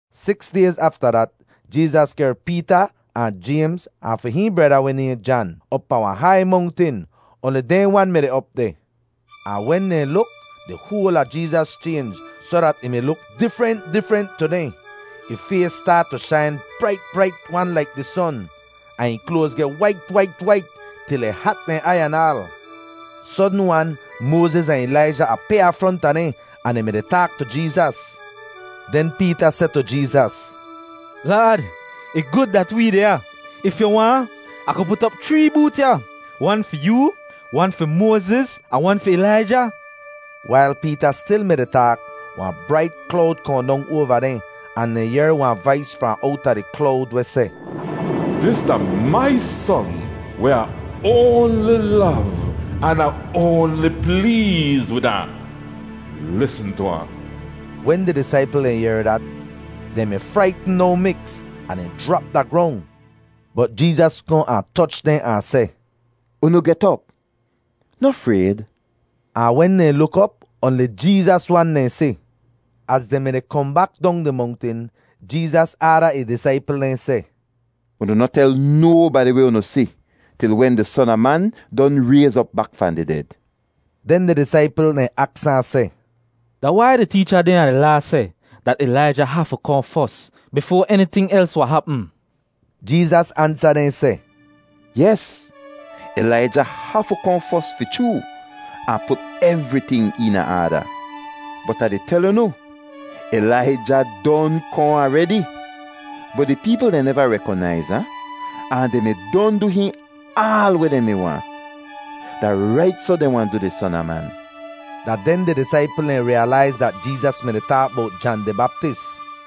Siks dayz afta dat, Jeezas kehr Peeta ahn Jaymz ahn fi hihn breda weh nayhn Jan op pahn wahn hai mongtin; oanli dehn wan mi deh op deh. Ahn wen dehn luk, di hoal a Jeezas chaynj soh dat ih mi luk difrent difrent tu dehn. Ih fays staat tu shain brait brait-wan laik di son, ahn ih kloaz geh wait wait wait, til ih hat dehn aiy anaal. Sodn-wan Moaziz ahn Ilaija apyaa fronta dehn ahn dehn mi-di taak tu Jeezas. Den Peeta seh tu Jeezas, “Laad, ih gud dat wee deh ya. If yu waahn, Ah ku put op chree boot ya, wan fi yoo, wan fi Moaziz, ahn wan fi Ilaija.” Wail Peeta stil mi-di taak, wahn brait klowd kohn dong oava dehn, ahn dehn yehr wahn vais fahn owta di klowd weh seh, “Dis da mai Son weh Ah oanli lov, an Ah oanli pleez wid ahn. Lisn tu ahn.” Wen di disaipl dehn yehr dat, dehn mi fraitn no miks, ahn dehn jrap da grong. Bot Jeezas kohn ahn toch dehn ahn seh, “Unu get op. Noh frayd.” Ahn wen dehn luk op, oanli Jeezas wan dehn si. Az dehn mi-di kohn bak dong di mongtin, Jeezas aada ih disaipl dehn seh, “Unu noh tel nobadi weh unu si til wen di Son a Man don rayz op bak fahn di ded.” Den di disaipl dehn aks ahn seh, “Da wai di teecha dehn a di Laa seh dat Ilaija hafu kohn fos bifoa eniting els wahn hapm?” Jeezas ansa dehn seh, “Yes, Ilaija hafu kohn fos fi chroo, ahn put evriting eena aada. Bot Ah di tel unu, Ilaija don kohn aredi, bot di peepl dehn neva rekonaiz ahn, ahn dehn mi don du hihn aal weh dehn mi waahn. Da rait soh dehn wahn du di Son a Man.” Da den di disaipl dehn riyalaiz dat Jeezas mi-di taak bowt Jan di Baptis.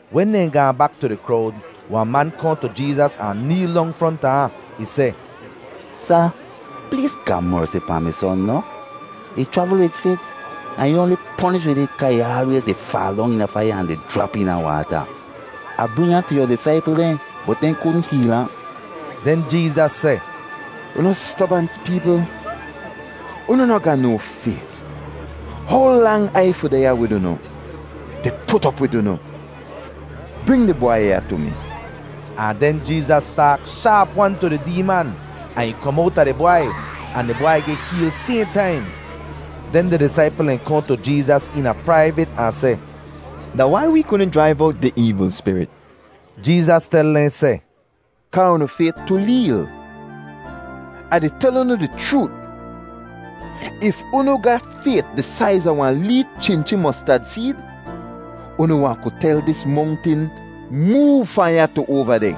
Wen dehn gaahn bak tu di krowd, wahn man kohn tu Jeezas ahn neel dong fronta ahn. Ih seh, “Sa, pleez ga mersi pahn mi son noh! Ih chravl wid fits, ahn ih oanli ponish wid it kaa ih aalwayz di faal dong eena faiya ahn di jrap eena waata. Ah bring ahn tu yu disaipl dehn bot dehn kudn heel ahn.” Den Jeezas seh, “Unu stobant peepl, unu noh ga no fayt. How lang Ai fi deh ya wid unu, di put op wid unu? Bring di bwai ya tu mi.” Ahn den Jeezas taak shaap-wan tu di deeman, ahn ih kom owta di bwai, ahn di bwai geh heel sayhn taim. Den di disaipl dehn kohn tu Jeezas eena praivit ahn seh, “Da wai wee kudn jraiv owt di eevl spirit?” Jeezas tel dehn seh, “Kaa unu fayt tu leel. Ah di tel unu di chroot, if unu ga fayt di saiz a wahn lee chinchi mostad seed, unu wahn ku tel dis mongtin, ‘Moov fahn ya tu oava deh,’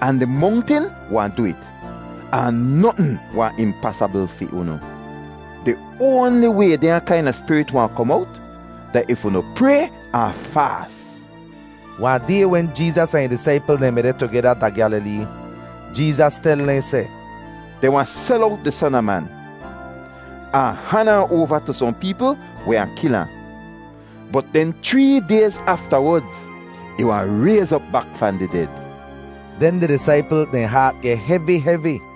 ahn di mongtin wahn du it; ahn notn wahn impasabl fi unu. [Di oanli way dehnya kaina spirit wahn kom owt da if unu pray ahn faas.”] Wahn day wen Jeezas ahn ih disaipl dehn mi deh tugeda da Gyalilee, Jeezas tel dehn seh, “Dehn wahn sel owt di Son a Man, ahn han ahn oava tu sohn peepl weh wahn kil ahn. Bot den chree dayz aftawodz ih wahn rayz op bak fahn di ded.” Den di disaipl dehn haat geh hevi hevi.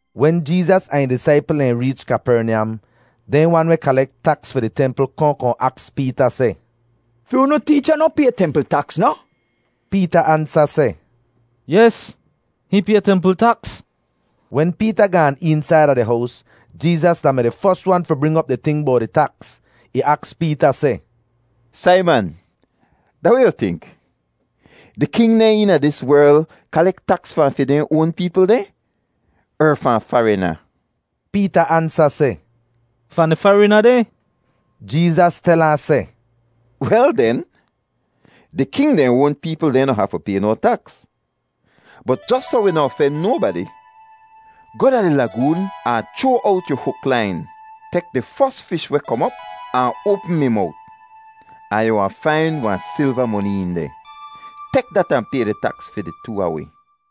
Wen Jeezas ahn ih disaipl dehn reech Kapernyam, dehn wan weh kalek taks fi di templ kohn kohn aks Peeta seh, “Fi unu teecha noh pay templ taks, noh?” Peeta ansa seh, “Yes, hihn pay templ taks.” Wen Peeta gaan eensaida di hows, Jeezas da-mi di fos wan fi bring op di ting bowt di taks. Ih aks Peeta seh, “Saiman, da weh yu tink? Di king dehn eena dis werl kalek taks fahn fi dehn oan peepl dehn er fahn farina?” Peeta ansa seh, “Fahn di farina dehn.” Jeezas tel ahn seh, “Wel den, di king dehn oan peepl dehn noh hafu pay no taks, bot jos soh wi noh ofen nobadi, goh da di lagoon ahn chroa owt yu huk lain; tek di fos fish weh kom op ahn oapm ih mowt, ahn yu wahn fain wahn silva moni een deh. Tek dat ahn pay di taks fi di too a wi.”